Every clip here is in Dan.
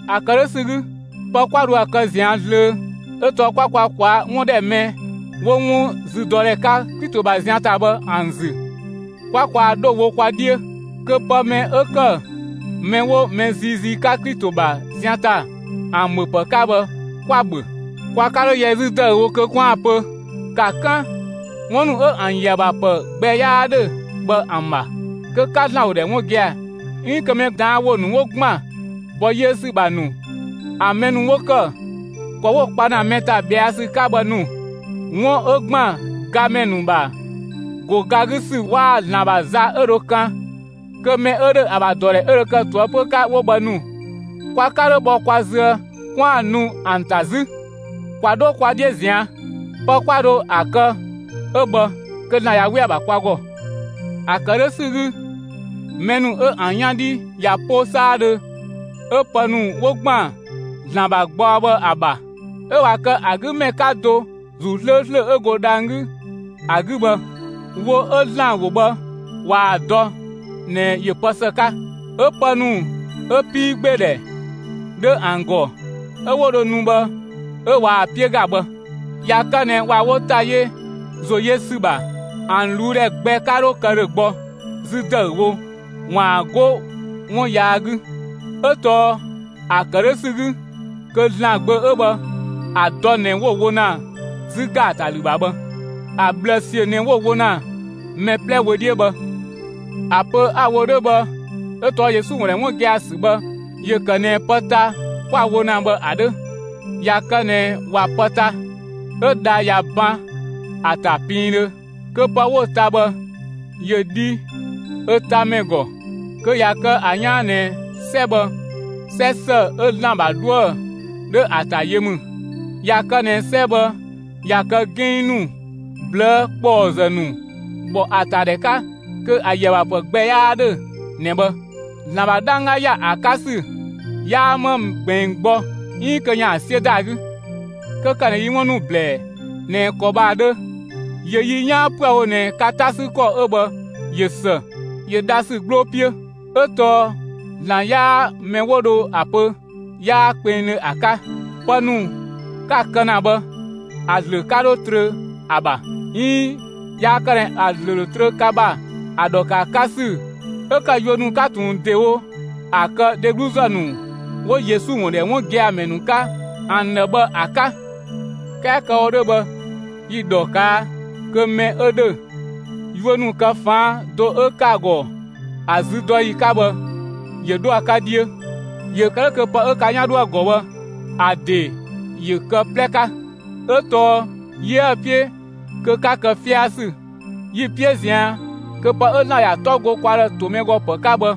‑A ‑kë 'dhö ‑sü 'gü, pë 'kwa dho ‑a kë ꞊zian' zlöö 'ö tɔɔ 'kwa kwa ꞊kwaa'‑ 'wun ‑dhɛ mɛ 'wo 'wun züdɔdhɛ 'ka Klito ‑bha zian ‑ta bhë ‑an ‑zü 'kwa kwaa‑ 'dho wo kwa 'dhiö, kö pë mɛ 'ö ‑kë mɛ 'wo mɛ ziizii 'ka Klito ‑bha zian ‑ta ‑an ‑bhöpë 'ka bhë 'kwa‑ ‑bhö. Kwa 'ka 'dho yɛ 'zü ‑dëüwo kö 'kwaan‑ pö ‑ka 'kan 'wun ‑nu 'ö ‑an ‑yö ‑a ‑bha ‑pë gbɛ 'yaa 'dhö bhë ‑an ‑bha kö 'ka ‑Zlan ‑wo ‑dhɛ 'wun gia‑, 'iin kö mɛ ꞊daan' ‑wo ‑nu 'wo ‑gban ‑bɔ yiö ‑sü ‑bha ‑nu, ‑an mɛ ‑nu 'wo ‑kë, ‑kɔ 'wo‑ kpa ‑na mɛ ‑ta ꞊bhɛa' ‑sü 'ka bhë ‑nu, 'wun 'ö ‑gban gamɛ ‑nu ‑bha ‑go ga 'gü ‑sü waa‑ ‑Zlan ‑bha za 'ö dho kan, kö mɛ 'ö ‑dhö ‑a ‑bha ‑dɔdhɛ 'ö dhö kë ꞊toëpö 'ka 'wo bhë ‑nu, kwa 'ka 'dho bhɔ kwa züë 'kwaan‑ nu ‑an ‑ta 'zü. ‑Kwa 'dho kwa 'dhiö ꞊zian'! Pë 'kwa dho ‑a kë 'ö bhë kö ‑Zlan ꞊ya 'we ‑a ‑bha kwa ‑gɔ. ‑A ‑kë 'dhö ‑sü 'gü, mɛ ‑nu 'ö ‑an 'yan 'dhi ꞊ya 'po 'saadhö 'ö pë ‑nu 'wo ‑gban ‑Zlan ‑bha gbaɔ bhë ‑a ‑bha, 'ö ꞊wa kë ‑a 'gü ‑mɛ 'ka do ‑Zuu 'slööslö 'ö go dhang‑ 'gü ‑a 'gü bhë, wo 'ö ‑Zlan ‑wo bhë ꞊waa‑ dɔ ꞊nɛ ‑yö pë ‑së 'ka, 'ö pë ‑nu 'ö 'piigbeedhɛ 'dhö ‑an ‑gɔ 'ö 'wo dho nu bhë 'ö ꞊waa‑ 'piö ‑ga bhë, ꞊ya kë ꞊nɛ ꞊wa wo ‑ta yö ‑zo yö ‑sü ‑bha, ‑an ꞊luu'‑ ‑dhɛ gbɛ 'ka 'dho kë ‑dhö gbɔ 'zü ‑dëüwo ‑waan 'go 'wun yaa 'gü. 'Ö tɔɔ ‑a ‑kë 'dhö ‑sü 'gü kö ‑Zlan Gbö 'ö bhë, ‑a dɔ ꞊nɛ 'wo‑ wo ‑na 'zü ‑gaatalü ‑bha bhë; ‑a ꞊bhlë ꞊siö ꞊nɛ 'wo‑ wo ‑na mɛ 'plɛ wö 'dhiö bhë. ‑A pö 'a‑ wo 'dhö bhë 'ö tɔɔ Yesu ‑wun ‑dhɛ 'wun gia‑ ‑sü bhë ‑yö ‑kë ꞊nɛ pë ta 'kwa‑ wo ‑na bhë ‑a 'dhö. ꞊Ya kë ꞊nɛ ꞊wa pë ta, 'ö dha ꞊ya ban ‑a ‑ta piindhö, kö pë 'wo‑ ta bhë ‑yö dhi ö tamɛ ‑gɔ, kö ꞊ya kë ‑a 'yaan ꞊nɛ 'sɛ bhë, 'sɛ ‑së 'ö ‑Zlan ‑bha 'dhuë‑ 'dhö ‑a ‑ta yö ‑mü. ꞊Ya kë ꞊nɛ 'sɛ bhë ꞊ya kë 'ginng ‑nu, ꞊blëë' ‑kpɔɔzë ‑nu ‑bhɔ ‑a ‑ta ‑dhɛ 'ka, kö ‑a ‑yö ‑a ‑bha ‑pë gbɛ 'yaa 'dhö ꞊nɛ bhë; ‑Zlan ‑bha 'dhangga ‑ya ‑a 'ka ‑sü 'yaa 'ma ꞊gbiin gbɔ 'iin kö ‑yaan 'siö ‑da ‑a 'gü. 'Kö ‑kë ꞊nɛ yi 'wun ‑nu ‑blɛɛ ꞊nɛ ‑kɔ bhë ‑a 'dhö, ‑yö yi 'yaan 'püë‑ wo ꞊nɛ ka 'ta 'sü ‑kɔ 'ö bhë ꞊yö ‑së; ‑yö dhasü 'gbloo 'piö. 'Ö tɔɔ ‑Zlan 'yaa mɛ 'wo dho ‑a pö 'yaa kpengdhö ‑a 'ka. Pë ‑nu 'ka‑ kë ‑na bhë, ‑a ‑zlö 'ka 'dho trö ‑a ‑bha; 'iin yaa kë ꞊nɛ ‑a ‑zlö ‑dho trö ka ‑bha ‑a ‑dhɔ ‑kë ‑a 'ka ‑sü 'ö ‑kë yuö ‑nu 'ka ꞊tun ‑dewo ‑a kë dhegluzë ‑nu 'wo Yesu ‑wun ‑dhɛ 'wun gia‑ ‑mɛ ‑nu 'ka ‑an ‑dhë bhë ‑a 'ka. 'Kɛɛ kë‑ wo 'dhö bhë, yi‑ ‑dhɔ ꞊kaa' kö mɛ 'ö ‑dhö, yuö ‑nu kë ‑faan do 'ö ‑kë ‑a ‑gɔ ‑a züdɔyi 'ka bhë, ‑yö 'dho ‑a 'ka 'dhiö; ‑yö kë 'dhö kö pë 'ö ka 'yan 'dho ‑a ‑gɔ bhë, ‑a ‑de ‑yö kë ö 'plɛ 'ka. 'Ö tɔɔ 'yiëë‑ 'piö kö 'ka kë 'fiasü; yi‑ 'piö ꞊zian' kö pë 'ö ‑Zlan ‑ya 'tɔ go kwa ‑dhë ‑to mɛ ‑gɔ ‑pë 'ka bhë,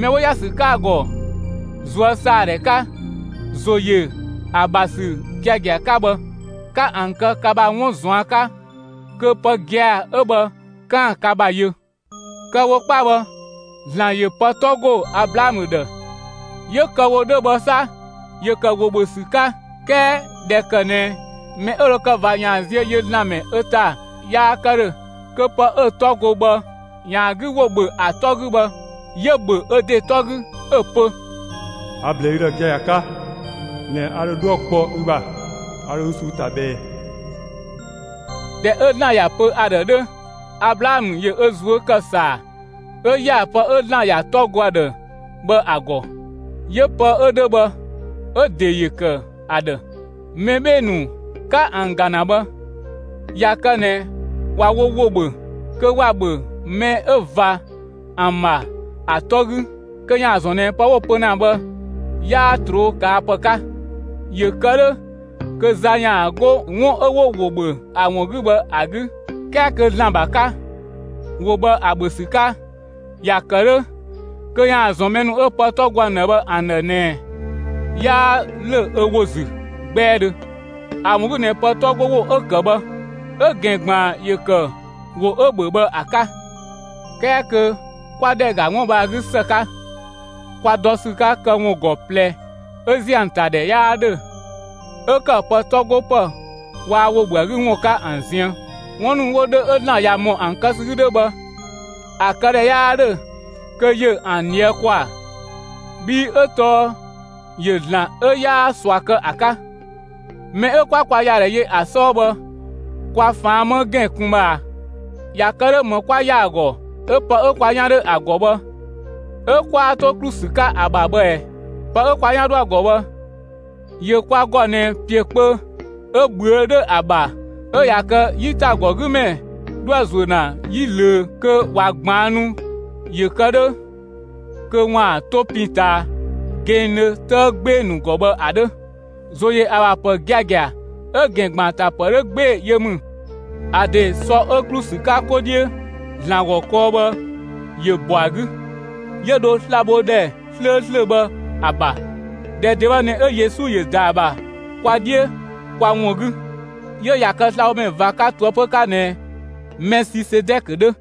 mɛ 'ö 'wo ‑ya ‑sü 'ka‑ ‑gɔ ꞊zuösaadhɛ 'ka, ‑zo ‑yö ‑a ‑bha ‑sü giagia 'ka bhë, 'ka ‑an kë ka ‑bha 'wun ꞊zuan' 'ka kö pë gia‑ 'ö bhë 'kaan‑ ka ‑bha yö. Kë‑ wo 'kpa bhë, ‑Zlan ‑yö pë 'tɔ ‑go Ablaamö ‑dhë; 'yö kë‑ wo 'dhö bhë 'sa, 'yö‑ ‑kë ‑wo ‑bhö ‑sü 'ka; 'kɛɛ ꞊dhɛ ‑kë ꞊nɛ mɛ 'ö dho kë ꞊va ‑yaan ziö yö ‑Zlan ‑mɛ ö ‑ta yaa kë ‑dhö kö pë 'ö‑ 'tɔ go bhë ‑yaan ‑a 'gü ‑wo ‑bhö ‑a 'tɔ 'gü bhë, 'yö‑ ‑bhö ö ‑de 'tɔ 'gü 'ö‑ pö: A‑ ‑blɛɛ ü ‑dhë giagia 'ka ꞊nɛ a ‑dho 'dhuë‑ kpɔ ü ‑bha, 'a dho ü ꞊suu'‑ ‑ta ꞊bhɛɛ. ꞊Dhɛ 'ö ‑Zlan ‑ya pö ‑a ‑dhë 'dhö, Ablaamö ‑yö ö ꞊zuö' ‑kë ‑saa 'ö ‑ya pë 'ö ‑Zlan ‑ya 'tɔ go ‑a ‑dhë bhë ‑a ‑gɔ. 'Yö pë 'ö 'dhö bhë, 'ö‑ ‑de ‑yö ‑kë ‑a ‑dhë. Mɛ 'bhee‑ ‑nu 'ka ‑an ‑ga ‑na bhë, ꞊ya kë ꞊nɛ ꞊wa wo ‑wo ‑bhö, kö ‑wa ‑bhö mɛ 'ö ꞊va ‑an ‑bha ‑a 'tɔ 'gü kö ‑yaan ‑zɔn ꞊nɛ pë 'wo‑ pö ‑na bhë 'yaa ꞊troo' ꞊kaa' ‑pë 'ka, ‑yö kë 'dhö kö za ‑yaan 'go 'wun 'ö 'wo ‑wo ‑bhö ‑a ‑wun 'gü bhë ‑a 'gü. 'Kɛɛ kö ‑Zlan ‑bha 'ka, ‑wo bhë ‑a ‑bhö ‑sü 'ka, ‑ya ‑kë 'dhö kö ‑yaan ‑zɔn mɛ ‑nu 'ö pë 'tɔ go ‑an ‑dhë bhë ‑an ‑dhë ꞊nɛ 'yaa ‑lö ö ‑wo ‑zü 'gbɛɛdhö; ‑a ‑wun 'gü ꞊nɛ pë 'tɔ 'go ‑wo 'ö‑ ‑kë bhë, 'ö‑ ‑gɛn ‑gbaan ‑yö ‑kë ‑wo 'ö‑ ‑bhö bhë ‑a 'ka. 'Kɛɛ kö kwa ‑dhɛ ‑ga 'wun bhë ‑a 'gü ‑së 'ka, kwa dɔ ‑sü 'ka këwun ‑gɔ ꞊plɛ 'ö ‑ziö ‑a ‑ta ‑dhɛ 'yaa 'dhö, 'ö ‑kë pë 'tɔ 'go ‑pë waa‑ ‑wo ‑bhö ‑a 'gü ‑wun 'ka ‑an ziën. 'Wun ‑nu 'wo 'dhö 'ö ‑Zlan ꞊ya ‑mɔ ‑an kë ‑sü 'gü 'dhö bhë, ‑a këdhɛ 'yaa ‑dhö kö ‑yö ‑an ꞊dhië' ‑kwaa, bhii 'ö tɔɔ ‑yö ‑Zlan 'ö 'yaa ꞊sua kë ‑a 'ka. Mɛ 'ö 'kwa kwa ‑ya ‑dhɛ yö ‑a 'sɔɔ bhë, kwa ꞊faan' 'më ‑gɛn kun bhë ꞊a; ꞊ya kë 'dhö, ‑më 'kwa ‑ya ‑a ‑gɔ 'ö pë 'ö kwa 'yan 'dhö ‑a ‑gɔ bhë 'ö 'kwaa 'to ‑klu ‑sü 'ka ‑a ‑bha bhë ꞊ɛɛ? Pë 'ö kwa 'yan 'dhö ‑a ‑gɔ bhë, ‑yö kwa ‑gɔ ꞊nɛ ‑piö kpö 'ö ꞊bhüö' 'dhö ‑a ‑bha 'ö ꞊ya kë 'yitagɔgümɛ 'dhoë‑ ꞊zuö' ‑na 'yi ꞊löö kö ꞊wa ꞊gbaannu ‑yö kë 'dhö kö ‑waan 'to pin ꞊taa gɛnngdhö 'tëë 'gbee‑ ‑nu ‑gɔ bhë ‑a 'dhö. ‑Zo ‑yö ‑a ‑bha ‑pë giagia 'ö‑ ‑gɛn ‑gban ‑a ‑ta ‑pë 'dhö 'gbee‑ yö ‑mü. ‑A ‑dee sɔ 'ö ‑klu ‑sü 'ka 'kɔ 'dhiö ‑Zlan ‑gɔ kɔɔ bhë ‑yö ‑bɔ ‑a 'gü, 'yö dho slabhodhɛ 'slööslö bhë ‑a ‑bha. ‑Dhɛ ‑de bhë ꞊nɛ 'ö Yesu ‑yö ‑da ‑a ‑bha kwa 'dhiö kwa ‑wun 'gü; 'yö ꞊ya kë slabhomɛ ꞊va 'ka ꞊toëpö 'ka ꞊nɛ Mɛsisedɛkö 'dhö.